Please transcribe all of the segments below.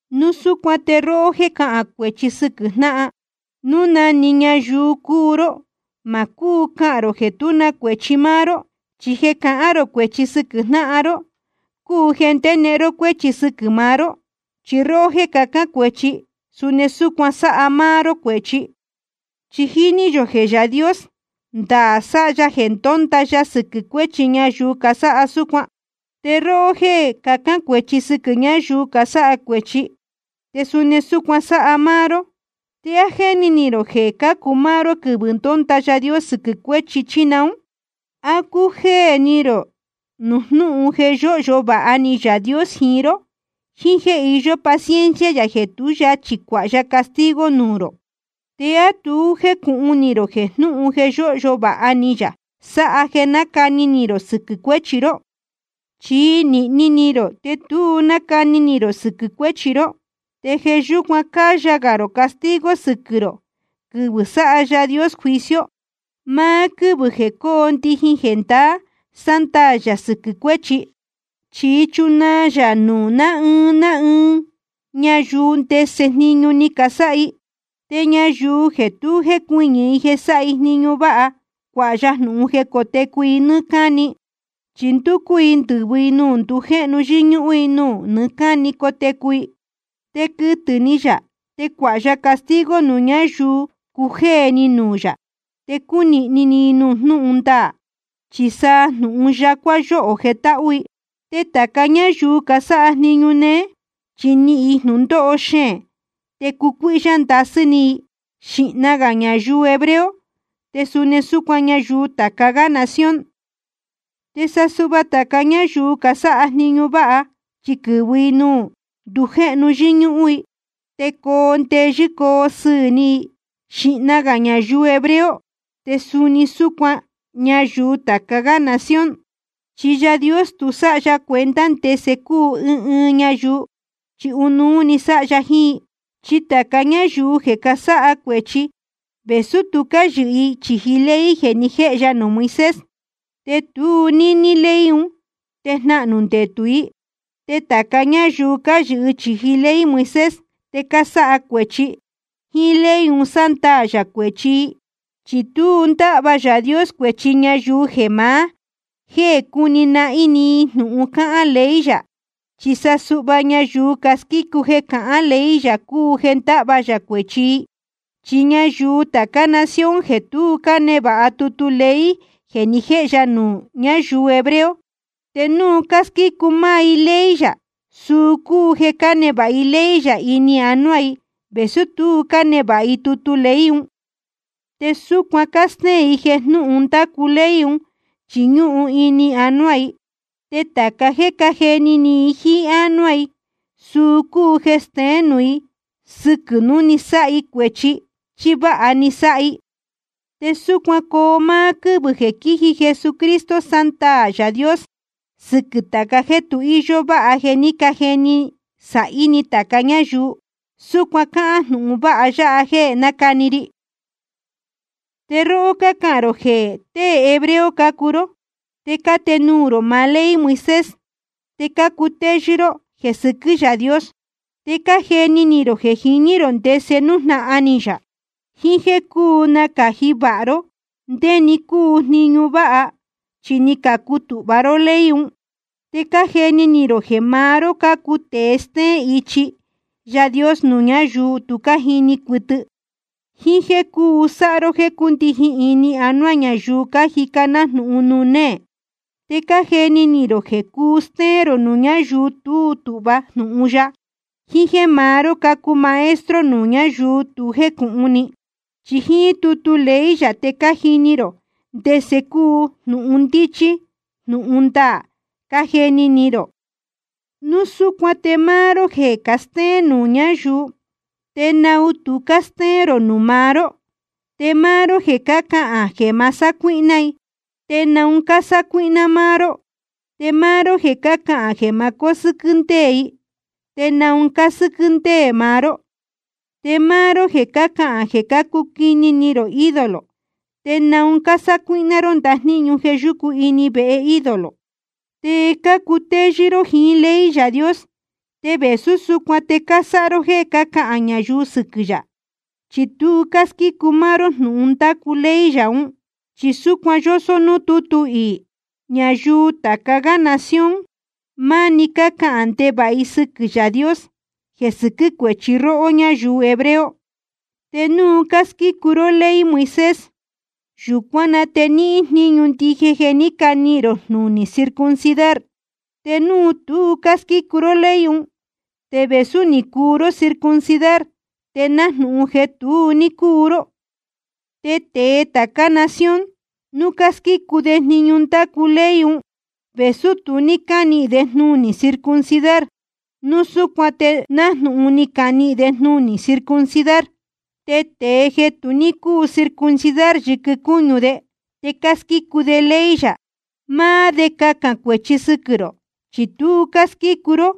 Núu súcuan te róhó jéē cahán cuēchi sɨquɨ̄ jnáhan, núu na‑ni ñayuu cúu ró, ma cúu cahān rō jeē tú na cuēchi máá ró. Chi jeē cahán rō cuēchi sɨquɨ̄ jnáhan ró cúu jeē ndénehen ró cuéchi sɨquɨ̄ maá ró. Chi róhó jéē cahán cuēchi, suni súcuan sáha máá ró cuēchi. Chi jíní yō jeē Yaā Dios, ndaā sáha ya jeē ndónda ya sɨquɨ̄ cuéchi ñayuu casáha súcuan. Te róhó jéē cahán cuēchi sɨquɨ̄ ñáyuu casáha cuēchi, te suni súcuan sáha máá ró, ¿te á jéni ni rō jeē cácu máá ró quɨvɨ̄ ndónda Yaā Dios sɨquɨ̄ cuéchi, chí naún? ¿A cújéē ni rō nuū jnúhun jeē yóhyo vāha ni Yaā Dios jiín ró, jíín jéē iyó paciencia yā jeē tú yachī cuāha ya castigo nuū rō? ¿Te á tu jécūhun ni rō jeē jnúhun jeē yóhyo vāha ni yā sáha jeē nácani ni rō sɨquɨ̄ cuéchi ró? Chi nīhni ni rō te tu nácani ni rō sɨquɨ̄ cuéchi ró. Te jeē yúcuan cáyā gā rō castigo sɨquɨ̄ rō quɨvɨ̄ sáha Yaā Dios juicio, máá quɨ́vɨ̄ jeē cóo ndijin jeē ndaā sándaā yā sɨquɨ̄ cuéchi. Chi chunaa yā nuū ná ɨɨn ná ɨɨn ñayuu núu ndese jniñu ni casáha i. Te ñayuu jeē tu jécuɨñɨ̄ i jeē sáha i jniñu váha, cuāha ya jnūhun jeē cótecu i nɨ́ɨ́ cáni. Chi ndúcú i quɨ̄vɨ i nuū ndujéhnu yɨ́ñúhún i, nuū nɨɨ́ cáni cotecu i. Te quɨtɨ̄ ni yā te cuāha ya castigo nuū ñáyuu cujéē ni nuū yā, te cúnīhni ni nuū jnúhun ndaā, chi sa nuū jnúhun yacuá yóho jetáhú i. Te tāca ñáyuu casáha jniñu néé, chi nihīn i jnūndóho xeēn te cucuíhyá ndasɨ́ ni i, xīhna gā ñayuu hebreo te suni súcuan ñayuu tāca gá nación. Te sa suhva tāca ñáyuu casáha jniñu váha, chi quɨ̄vɨ i nuū ndujéhnu yɨ́ñúhún i, te coo ndeyɨ́ coo sɨɨ̄ ni i, xīhna gā ñayuu hebreo te suni súcuan ñayuu tāca gá nación. Chi Yaā Dios tu sáha ya cuenta ndese cúu ɨɨn ɨɨn ñayuu, chi ɨnuú sáha ya jiín i. Chi tāca ñáyuu jeē casáha cuēchi, vēsú tu cáyɨhɨ i chīji ley jeē ni jéhe ya nuū Moisés, te tu níní ley un te jnahnū ndetū i. Te tāca ñáyuu cáyɨhɨ chīji ley Moisés te cásáha cuēchi, jíín ley un sándaā yā cuēchi i. Chi tu ndáhva Yaā Dios cuēchi ñayuu jeē maá jéē cúni nahín‑ni i jnūhun cáhán ley yā. Chi sa suhva ñayuu squícu jeē cahán ley yā cúu jeē ndáhva yā cuēchi i. Chi ñayuu tācá nación jeē tu cánevāha tutu ley jeē ni jéhe ya nuū ñáyuu hebreo, te núu cásquícu máá i ley yā, suu cúu jeē cánevāha i ley yā ini anuá i, vēsú tu cánevāha i tutu ley un. Te súcuan cástéén i jeē jnúhun ndácu ley un chi ñúhun ini anuá i. Te tāca jéē cájeni ni i jíín ánuá i, suu cúu jeē steén nuū i sɨquɨ̄ núu ni sáha i cuēchi chí váha ni sáha i. Te súcuan coo máá quɨ́vɨ̄ jeē jiín Jesucristo sándaā Yaā Dios sɨquɨ̄ tāca jéē tu íyó váha jeē ní cajeni sāhí ni tāca ñáyuu. Súcuan cáhán jnūhun vāha ya jeē nácani ri. Te róhó cácahān rō jeē tée hebreo cácuu ró, te cátenuū rō maá ley Moisés, te cácutéyɨ́ ró jeē sɨquɨ́ Yaā Dios. Te cájeni ni rō jeē jiní rō ndese nújnahan ni yā, jiín jéē cúu nácāji vāha ró ndé‑ni cúu jniñu váha, chi ni cacutūhva ró ley un. Te cájeni ni rō jeē maá ró cácuu tēe stéén ichi Yaā Dios nuū ñáyuu tu cájini cuɨtɨ, jíín jéē cúu sáha ró jéē cúndijin ini anuá ñayuu cájica nájnūhun nuū néē. Te cájeni ni rō jeē cúu stéén rō nuū ñáyuu tú tūhva jnūhun ya, jiín jéē maá ró cácuu maestro nuū ñáyuu tu jécūhun ni. Chi jíín tutu ley yā te cájini rō ndese cúu jnūhun ndíchí jnūhun ndaā, cájeni ni rō. Núu súcuan te máá ró jeē castéén nuū ñáyuu, ¿te naun tu cástéén rō nuū maá ró? Te máá ró jeē cácahān jeē ma sácuíhná i, ¿te naun cásácuíhná máá ró? Te máá ró jeē cácahān jeē ma cósɨ́quɨ́ ndéē i, ¿te naun cásɨ́quɨ́ ndéē maá ró? Te máá ró jeē cácahān jeē cácuquini ni rō ídolo, ¿te naun cásácuíhná ró ndajníñu jeē yúcu ini vehe ídolo? Te cácutéyɨ́ ró jiín ley Yaā Dios, te vēsú súcuan te cásáha ró jéē cácahān ñayuu sɨquɨ̄ yā, chi tu cásquícu máá ró jnūhun ndácu ley yā ún. Chi súcuan yósó núū tútu iī: Ñayuu tāca gá nación, máni cácahān ndevāha i sɨquɨ̄ Yaā Dios, jeē sɨquɨ́ cuéchi róhó ñáyuu hebreo. Te núu cásquícu ró ley Moisés, yūcuán na te níhín jníñu ndije jeē ní canihīn rō jnunī circuncidar. Te núu tu cásquícu ró ley un, te vēsú ni cuu ró circuncidar, te nájnūhun jeē tu ní cúu ró. Te tēe tācá nación, núu cásquícu de jniñu ndácu ley un, vēsú tu ní cánihīn de jnunī circuncidar, núu súcuan te nájnūhun ni canihīn de jnunī circuncidar. Te tēe jeē tu ní cúu circuncidar yɨquɨ cúñu de, te cásquícu de ley yā, máá de cahān cuēchi sɨquɨ̄ rō. Chi tu cásquícu ró,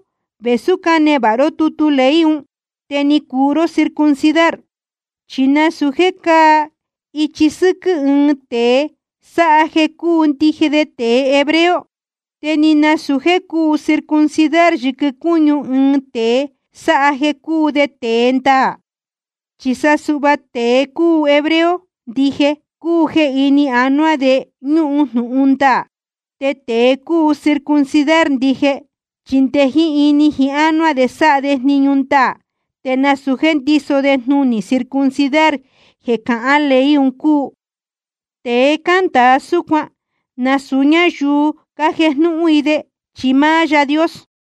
vēsú cánevāha ró tutu ley un, te ni cuu ró circuncidar. Chi nasūu jéē cáa ichi sɨ́quɨ́ ɨɨn tēe sáha jeē cúu ndije de tēe hebreo. Te ni nasūu jéē cúu circuncidar yɨquɨ cúñu ɨɨn tēe sáha jeē cúu de tēe ndaā. Chi sa suhva tēe cúu hebreo ndije, cúu jeē ini anuá de ñúhun jnūhun ndaā. Te tēe cúu circuncidar ndije, chi nde jiín ini jiín ánuá de sáha de jniñu ndaā te nasūu jéē ndíso de jnunī circuncidar jeē cahán ley un cúu. Tēe cándāa súcuan, nasūu ñáyuu cájejnúhún i de, chi máá Yaā Dios.